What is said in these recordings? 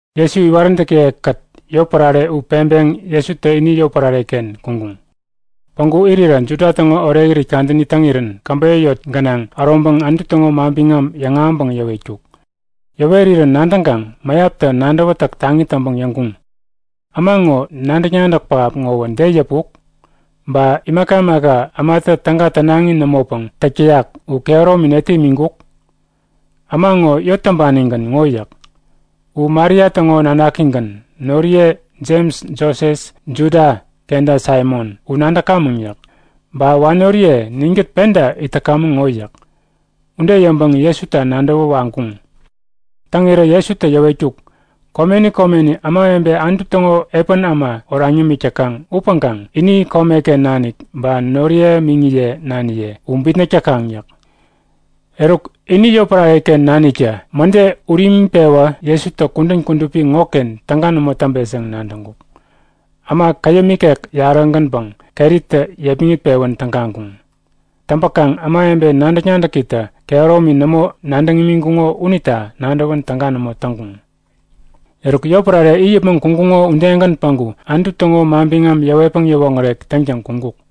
Jesu iwaräntäkiye-kät yotpärare u peŋpeŋ Jesutä ini yotpärare-ken kuŋkuŋ. Päŋku irirä Juda täŋo Orekirit kadäni täŋirän käbeyä yot gänaŋ äroŋpäŋ Anutu täŋo manbiŋam yäŋahäŋpäŋ yäwetkuk. Yäwerirän nadäŋkaŋ mäyaptä nadäwätäk taŋi täŋpäŋ yäŋkuŋ; Äma ŋo nadäk-nadäk pähap ŋowä de yäpuk? Ba imaka imaka ämatä täga tänaŋi nämopäŋ täk täyak u kehäromi netä imiŋkuk? Äma ŋo yot täŋpanigän ŋo yäk. U Maria täŋo nanakigän. Noriye Jems, Joses, Juda kenta Saimon u nadäkamäŋ yäk. Ba wanoriye ninkät penta it täkamäŋ ŋo yäk. Ude yäŋpäŋ Jesuta nadäwä wakŋkuŋ. Täŋirä Jesutä yäwetkuk; Komeni komeni ämawebe Anutu täŋo epän äma oraŋ yämik täkaŋ upäŋkaŋ ini komeken nanik ba noriye miŋiye naniye u bitnäk täkaŋ yäk. Eruk, ini yotpärare-ken naniktä mäde ude ut imiŋpewä Jesutä kudän kudupi ŋoken täga nämo täŋpet yäŋ nadäŋkuk. Äma käyäm ikek yarä-gänpäŋ keritä yepmäŋit-pewän tägaŋkuŋ. Täŋpäkaŋ ämawebe nadäk-nadäkitä kehäromi nämo nadäŋ imiŋkuŋo unita nadäwän täga nämo täŋkuŋ. Eruk yotpärare it yäpmäŋ kuŋkuŋo udegän päŋku Anutu täŋo manbiŋam yäwetpäŋ yäwoŋärek täŋtäŋ kuŋkuk.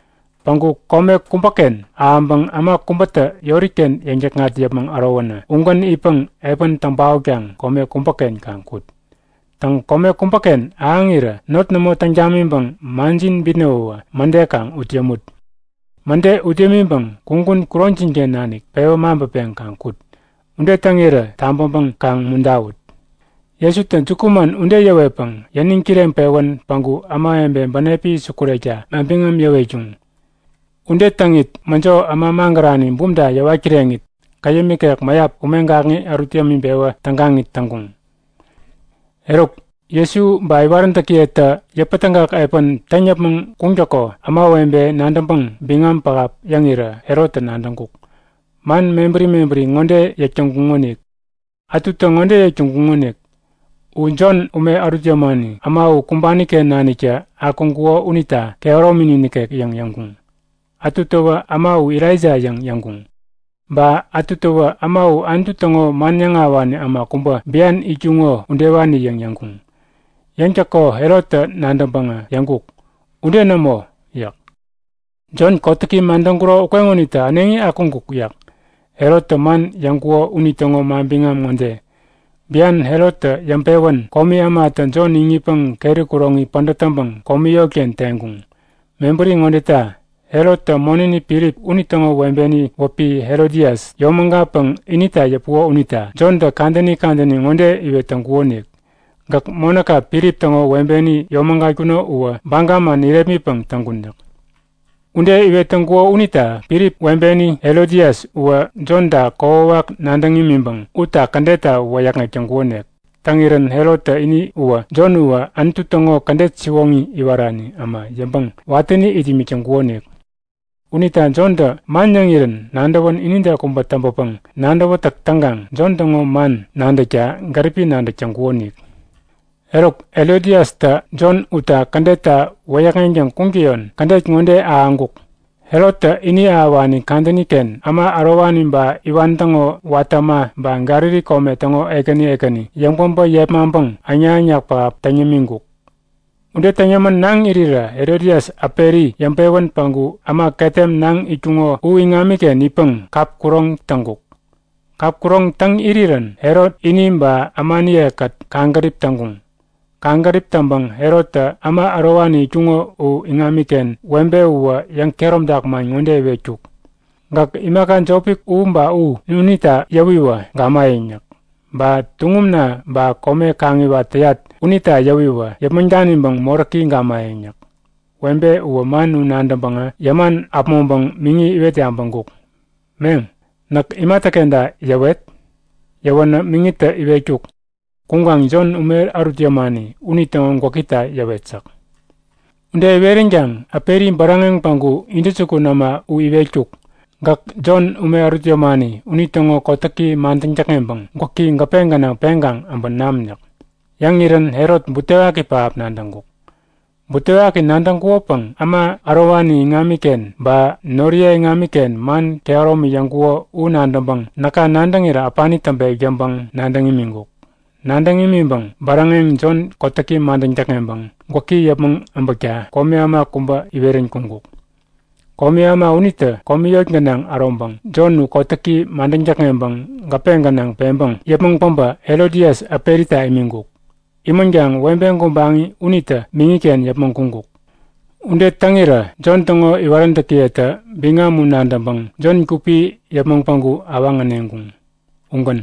Päŋku kome kubäken ahäŋpäŋ äma kubätä yori-ken yäŋ-täkŋat yäpmäŋ ärowänä ugän itpäŋ epän täŋ paotkaŋ kome kubäken kaŋ kut. Täŋ, kome kubäken ahäŋirä not nämo täŋ tamiŋpäŋ manjin bitnäwäwä mäde kaŋ ut yämut. Mäde ut yämiŋpäŋ kugun kuroŋjin-ken nanik pewä maŋpäpeŋ kaŋ kut. Ude täŋirä tabäŋpäŋ kaŋ umuntawut! Jesutä jukuman ude yäwetpäŋ yäniŋ kireŋpewän päŋku ämawebe bänepi sukurekta manbiŋam yäwetkuŋ. Ude täŋit mäjo äma magärani bumta yäwat kireŋit, käyäm ikek mäyap ume gakŋi ärut yämiŋpewä tägaŋit täŋkuŋ. Eruk, Jesu ba iwaräntäkiyetä yäpätägak epän täŋ yäpmäŋ kuŋtäko ämawebetä nadäŋpäŋ biŋam pähap yäŋirä Herottä nadäŋkuk. Man mebäri mebäri ŋode yäk täŋkuŋonik. Ätutä ŋode yäk täŋkuŋonik; U Jon ume ärut yämani äma u kumbani-ken naniktä akuŋkuko unita kehäromini nikek yäŋ yäŋkuŋ. Ätu täwä Äma u Elaija yäŋ yäŋkuŋ. Ba ätu täwä Äma u Anutu täŋo man yäŋahäwani äma kubä bian itkuŋo udewani yäŋ yäŋkuŋ. Yäŋtäko Herottä nadäŋpäŋä yäŋkuk; Ude nämo! yäk. Jon kotäki madäŋkuro ukeŋonitä äneŋi akuŋkuk! yäk. Herottä man yäŋkuko unitäŋo manbiŋam ŋode; Bian Herottä yäŋpewän komi ämatä Jon iŋitpäŋ keri kuroŋi pädät täŋpäŋ komi yotken teŋkuŋ. Mebäri ŋodeta; Herottä monäni Filip unitäŋo webeni wäpi Herodias yomägatpäŋ inita yäpuko unita Jontä kadäni kadäni ŋode iwet täŋkukonik; Gäk monäka Filip täŋo webeni yomägatkuno uwä baga man irepmitpäŋ täŋkun yäk. Ude iwet täŋkuko unita Filip webeni Herodias uwä Jonta kokwawak nadäŋ imiŋpäŋ utta kädetta wäyäkŋek täŋkukonik. Täŋirän Herottä ini uwä Jon uwä Anutu täŋo kädet siwoŋi iwarani äma yäŋpäŋ watäni it imik täŋkukonik. Unita Jontä man yäŋirän nadäwän inide kubä täŋpäpäŋ nadäwätäk täŋkaŋ Jon täŋo man nadäkta gäripi nadäk täŋkukonik. Eruk Herodiastä Jon utta kädetta wäyäkŋeŋtäŋ kuŋtäyon kädet ŋode ahäŋkuk; Herottä ini ahäwani kadäni-ken äma ärowani ba iwan täŋo watä äma ba Galili kome täŋo ekäni ekäni yäŋpäbä yepmaŋpäŋ äŋnak-äŋnak pähap täŋ yämiŋkuk. Ude täŋ yämän naŋ irirä Herodias äperi yäŋpewän päŋku äma ketem naŋ itkuŋo u iŋamiken itpäŋ kap kuroŋ täŋkuk. Kap kuroŋ täŋ irirän Herot ini ba ämaniye-kät kaŋgärip täŋkuŋ. Kaŋgärip täŋpäŋ Herottä äma ärowani itkuŋo u iŋamiken webe uwä yäŋkehäromtak man ŋode iwetkuk; Gäk imaka jopi u ba u unita yäwiwä gamayäŋ yäk. Ba tuŋumna ba kome kaŋiwat täyat unita yäwiwä yäpmäŋ daniŋpäŋ moräki gamayäŋ yäk. Webe uwä man u nadäŋpäŋä yäman äpmoŋpäŋ miŋi iwet yabäŋkuk; Meŋ, näk imatäkenta yäweret? Yäwänä miŋitä iwetkuk; Kuŋkaŋ Jon, ume ärut yämani unitäŋo gwäkita yäwet yäk. Ude iweränkaŋ äperi bäräŋeŋ päŋku intäjukun äma u iwetkuk; Gäk Jon, ume ärut yämani unitäŋo kotäki madäŋ täkŋeŋpäŋ gwäki gäpe gänaŋ peŋkaŋ äbä nam yäk. Yäŋirän Herot butewaki pähap nadäŋkuk. Butewaki nadäŋkukopäŋ äma ärowani iŋamiken ba noriye iŋamiken man kehäromi yäŋkuko u nadäŋpäŋ näka nadäŋirä äpani täŋpek yäŋpäŋ nadäŋ imiŋkuk. Nadäŋ imiŋpäŋ bäräŋeŋ Jon kotäki madäŋ täkŋeŋpäŋ gwäki yäpmäŋ äbäkta komi äma kubä iwerän kuŋkuk. Komi äma unitä komi yot gänaŋ äroŋpäŋ Jon u kotäki madäŋ täkŋeŋpäŋ gäpe gänaŋ peŋpäŋ yäpmäŋ päbä Herodias äperita imiŋkuk. Imänkaŋ webe gubaŋi unitä miŋiken yäpmäŋ kuŋkuk. Ude täŋirä Jon täŋo iwaräntäkiyetä biŋam u nadäŋpäŋ Jon gupi yäpmäŋ päŋku awaŋ äneŋkuŋ. Ugän.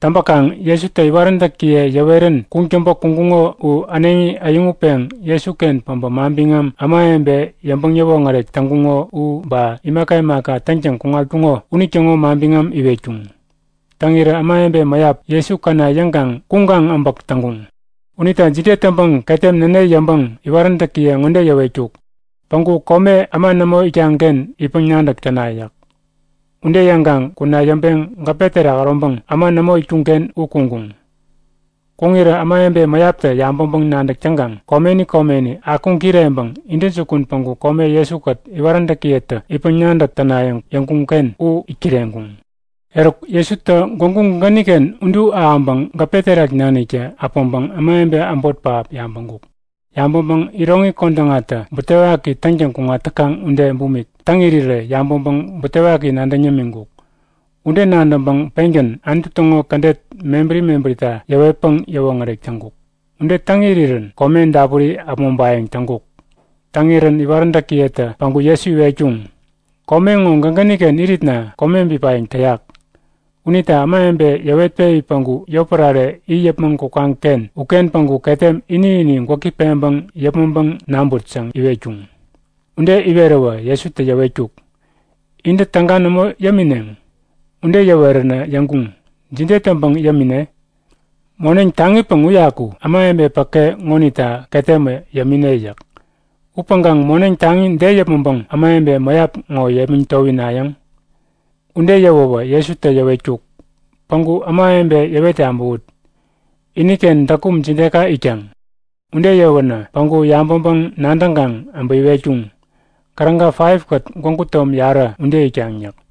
Täŋpäkaŋ Jesutä iwaräntäkiye yäwerän kuŋtäŋpä kuŋkuŋo u äneŋi äyäŋutpeŋ Jesuken päbä manbiŋam ämawebe yäŋpäŋ-yäwoŋärek täŋkuŋo u ba imaka imaka täŋtäŋ kuŋatkuŋo unitäŋo manbiŋam iwetkuŋ. Täŋirä ämawebe mäyap Jesu käna yäŋkaŋ kuŋkaŋ äbäk täŋkuŋ. Unita jide täŋpäŋ ketem näne yäŋpäŋ iwaräntäkiye ŋode yäwetkuk; Päŋku kome äma nämo itkaŋ-ken itpäŋ-nadäk täna yäk. Ude yäŋkaŋ kuna yäŋpeŋ gäpe terak äroŋpäŋ äma nämo itkuŋ-ken u kuŋkuŋ. Kuŋirä ämawebe mäyaptä yabäŋpäŋ-nadäk täŋkaŋ komeni komeni akuŋ kireŋpäŋ intäjukun päŋku kome Jesu-kät iwaräntäkiyetä itpäŋ-nadäk tänayäŋ yäŋkuŋ-ken u it kireŋkuŋ. Eruk Jesutä gwägu gägäni-ken udu ahäŋpäŋ gäpe terak naniktä äpäŋpäŋ ämawebe äbot pähap yabäŋkuk. Yabäŋpäŋ iroŋi kodäŋatä butewaki täŋtäŋ kuŋat täkaŋ ude bumik täŋ irirä yabäŋpäŋ butewaki nadäŋ yämiŋkuk. Ude nadäŋpäŋ pengän Anutu täŋo kädet mebäri mebärita yäwetpäŋ yäwoŋärek täŋkuk. Ude täŋ irirän kome dapuri äpmoŋpayäŋ täŋkuk. Täŋirän iwaräntäkiyetä päŋku Jesu iwetkuŋ; Kome ŋo gägäni-ken iritna kome bipayäŋ täyak. Unita ämawebe yäwetpewi päŋku yotpärare it yäpmäŋ kukaŋ-ken uken päŋku ketem ini-ini gwäki peŋpäŋ yäpmäŋpäŋ naŋput yäŋ iwetkuŋ. Ude iweräwä Jesutä yäwetkuk; Intä täga nämo yämineŋ? Ude yäweränä yäŋkuŋ; Jide täŋpäŋ yämine? Moneŋ taŋipäŋ uyaku ämawebe päke ŋonita ketemä yämine yäk. Upäŋkaŋ moneŋ taŋi de yäpmäŋpäŋ ämawebe mäyap ŋo yepmäŋ towinayäŋ? Ude yäwäwä Jesutä yäwetkuk; Päŋku ämawebe yäwet yabäwut. Iniken däkum jideka itkaŋ? Ude yäwänä päŋku yabäŋpäŋ-nadäŋkaŋ äbä iwetkuŋ; Käräga 5kät gwägu tom yarä ude itkaŋ yäk.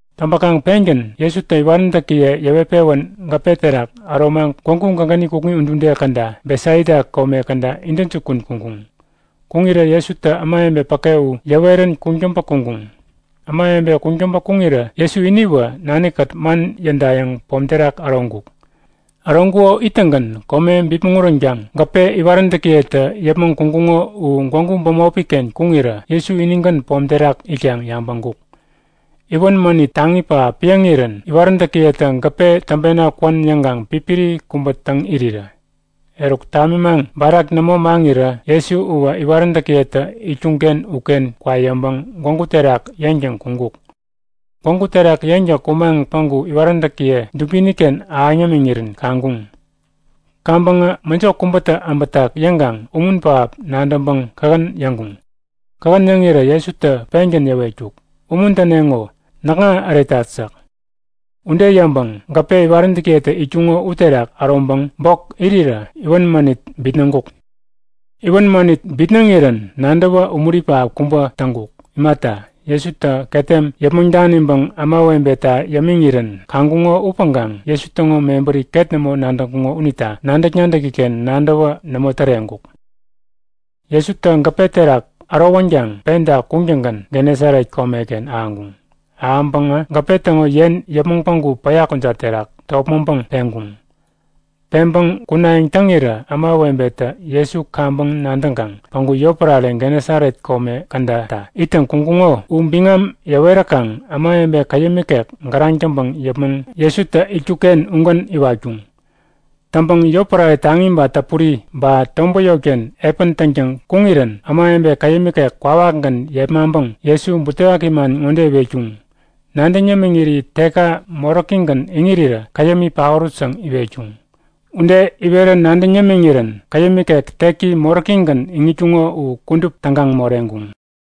Täŋpäkaŋ pengän Jesutä iwaräntäkiye yäwet-pewän gäpe terak äromaŋ gwägu gägäni kukŋi udude käda Betsaida kome käda intäjukun kuŋkuŋ. Kuŋirä Jesutä ämawebe päke u yäwerän kuŋtäŋpä kuŋkuŋ. Ämawebe kuŋtäŋpä kuŋirä Jesu iniwä nani-kät man yädayäŋ pom terak äroŋkuk. Äroŋkuko ittäŋgän kome bipmäŋ uränkaŋ gäpe iwaräntäkiyetä yäpmäŋ kuŋkuŋo u gwägu bämopi-ken kuŋirä Jesu inigän pom terak itkaŋ yabäŋkuk. Iwän mänit taŋi pähap piäŋirän iwaräntäkiyetä gäpe täŋpena kwän yäŋkaŋ pipiri kubä täŋ irirä. Eruk tamimaŋ barak nämo maŋirirä Jesu uwä iwaräntäkiyetä itkuŋ-ken uken kwa yäŋpäŋ gwägu terak yeŋtäŋ kuŋkuk. Gwägu terak yeŋtäŋ kumaŋ päŋku iwaräntäkiye dubini-ken ahäŋ yämiŋirän kaŋkuŋ. Kaŋpäŋä mäjo kubätä äbätak yäŋkaŋ umun pähap nadäŋpäŋ kähän yäŋkuŋ. Kähän yäŋirä Jesutä pengän yäwetkuk; Umuntäneŋo, näkŋa äretat yäk. Ude yäŋpäŋ gäpe iwaräntäkiyetä itkuŋo uterak äroŋpäŋ bok irirä iwän mänit bitnäŋkuk. Iwän mänit bitnäŋirän nadäwä umuri pähap kubä täŋkuk. Imata, Jesutä ketem yäpmäŋ daniŋpäŋ ämawebeta yämiŋirän kaŋkuŋo upäŋkaŋ Jesu täŋo mebäri ket nämo nadäŋkuŋo unita nadäk-nadäki-ken nadäwä nämo täreŋkuk. Jesutä gäpe terak ärowänkaŋ penta kuŋtäŋgän Genesaret komeken ahäŋkuŋ. Ahäŋpäŋä gäpe täŋo yen yäpmäŋ päŋku päya kujat terak topmäŋpäŋ peŋkuŋ. Peŋpäŋ kunayäŋ täŋirä ämawebetä Jesu kaŋpäŋ nadäŋkaŋ päŋku yotpärare Genesaret kome kädata ittäŋ kuŋkuŋo u biŋam yäweräkaŋ ämawebe käyäm ikek gäraŋ täŋpäŋ yäpmäŋ Jesutä itkuk-ken ugän iwatkuŋ. Täŋpäŋ yotpärare taŋi ba täpuri ba tobät yotken epän täŋtäŋ kuŋirän ämawebe käyäm ikek kwawakgän yepmaŋpäŋ Jesu butewaki man ŋode iwetkuŋ; Nadäŋ yämiŋiri tekka moräkigän iŋirirä käyämi paorut yäŋ iwetkuŋ. Ude iwerä nadäŋ yämiŋirän käyäm ikek teki moräkigän iŋitkuŋo u kudup tägaŋ moreŋkuŋ.